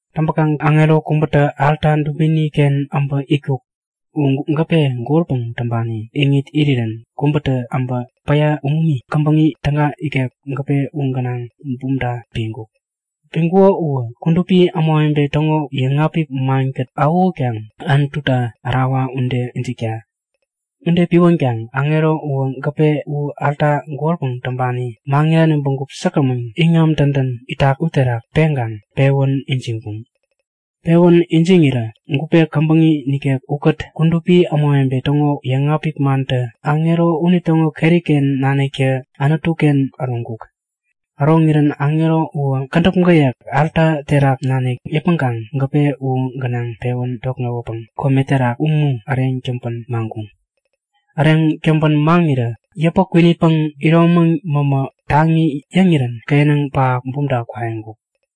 Täŋpäkaŋ aŋero kubätä alta dubini-ken äbä itkuk. U gäpe golpäŋ täŋpani iŋit irirän kubätä äbä päya umumi käbäŋi täga nikek gäpe u gänaŋ bumta piŋkuk. Piŋkuko uwä kudupi ämawebe täŋo yäŋapik mankät awähutkaŋ Anututa ärawa ude ijikta. Ude piwänkaŋ aŋero uwä gäpe u alta golpäŋ täŋpani, maŋirani bägup säkgämän iŋam dädän itak uterak peŋkaŋ pewän ijiŋkuŋ. Pewän ijiŋirä gupe käbäŋi nikek ukät kudupi ämawebe täŋo yäŋapik mantä aŋero unitäŋo keri-ken naniktä Anutu-ken äroŋkuk. Äroŋirän aŋero uwä kädäp gäyek alta terak nanik yäpmäŋkaŋ gäpe u gänaŋ pewän tokŋewäpäŋ kome terak umu äreŋ täŋpän maŋkuŋ. Äreŋ täŋpän maŋirä yäpä kwinitpäŋ, iromäŋ mämä taŋi yäŋirän kenäŋ pähap bumta kwaiŋkuk.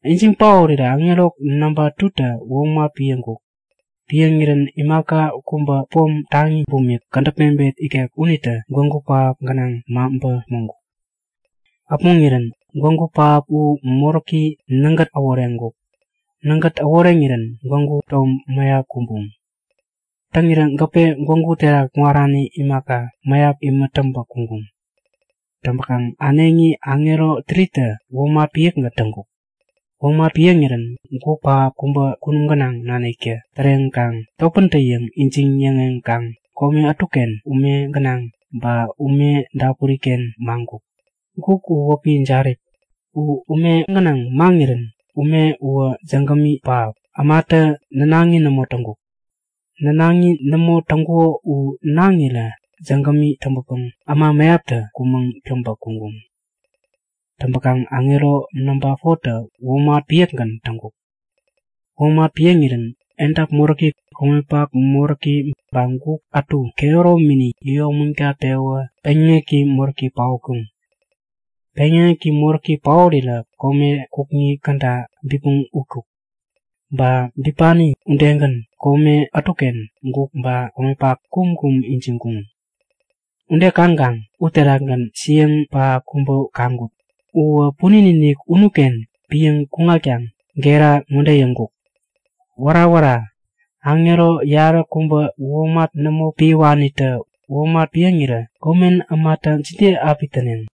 Ijiŋ paorirä aŋero namba 2tä womat piäŋkuk. Piäŋirän imaka kubä pom taŋi bumik, kädäp mebet ikek unitä gwägu pähap gänaŋ maŋpä äpmoŋkuk. Äpmoŋirän gwägu pähap u moräki nägät äworeŋkuk. Nägät äworeŋirän gwägu tom mäyap kumbuŋ. Täŋirä gäpe, gwägu uterak kuŋarani imaka, mäyap imät täŋpä kuŋkuŋ. Täŋpäkaŋ äneŋi aŋero 3tä womat piäkgän täŋkuk. Womat piäŋirän guk pähap kubä kunum gänaŋ naniktä täreŋkaŋ topäntä-yäŋ ijiŋ-yäŋeŋkaŋ kome ätuken ume gänaŋ ba ume dapuri-ken maŋkuk. Guk u wäpi Jarip. U ume gänaŋ maŋirän ume uwä jägämi pähap, ämatä nänaŋi nämo täŋkuk. Nänaŋi nämo täŋkuko u naŋirä jägämi täŋpäpäŋ äma mäyaptä kumäŋ täŋpä kuŋkuŋ. Täŋpäkaŋ aŋero namba 4tä womat piäkgän täŋkuk. Womat piäŋirän edap moräki, komepak moräki ba guk ätu kehäromini yäyomägat-pewä peŋyäŋeki moräki paotkuŋ. Peŋyäŋeki moräki paorirä kome kukŋi käda bipmäŋ utkuk. Ba bipani udegän, kome ätuken guk ba komepak kumkum ijiŋkuŋ. Ude kaŋkaŋ uterakgän siäŋ pähap kubä kaŋkut. Uwä punin-inik unuken piäŋ kuŋkaŋ gera ŋode yäŋkuk; Wära! wära! Aŋero yaräkubä womat nämo piäwanitä womat piäŋirä komen ämatä jide api täneŋ?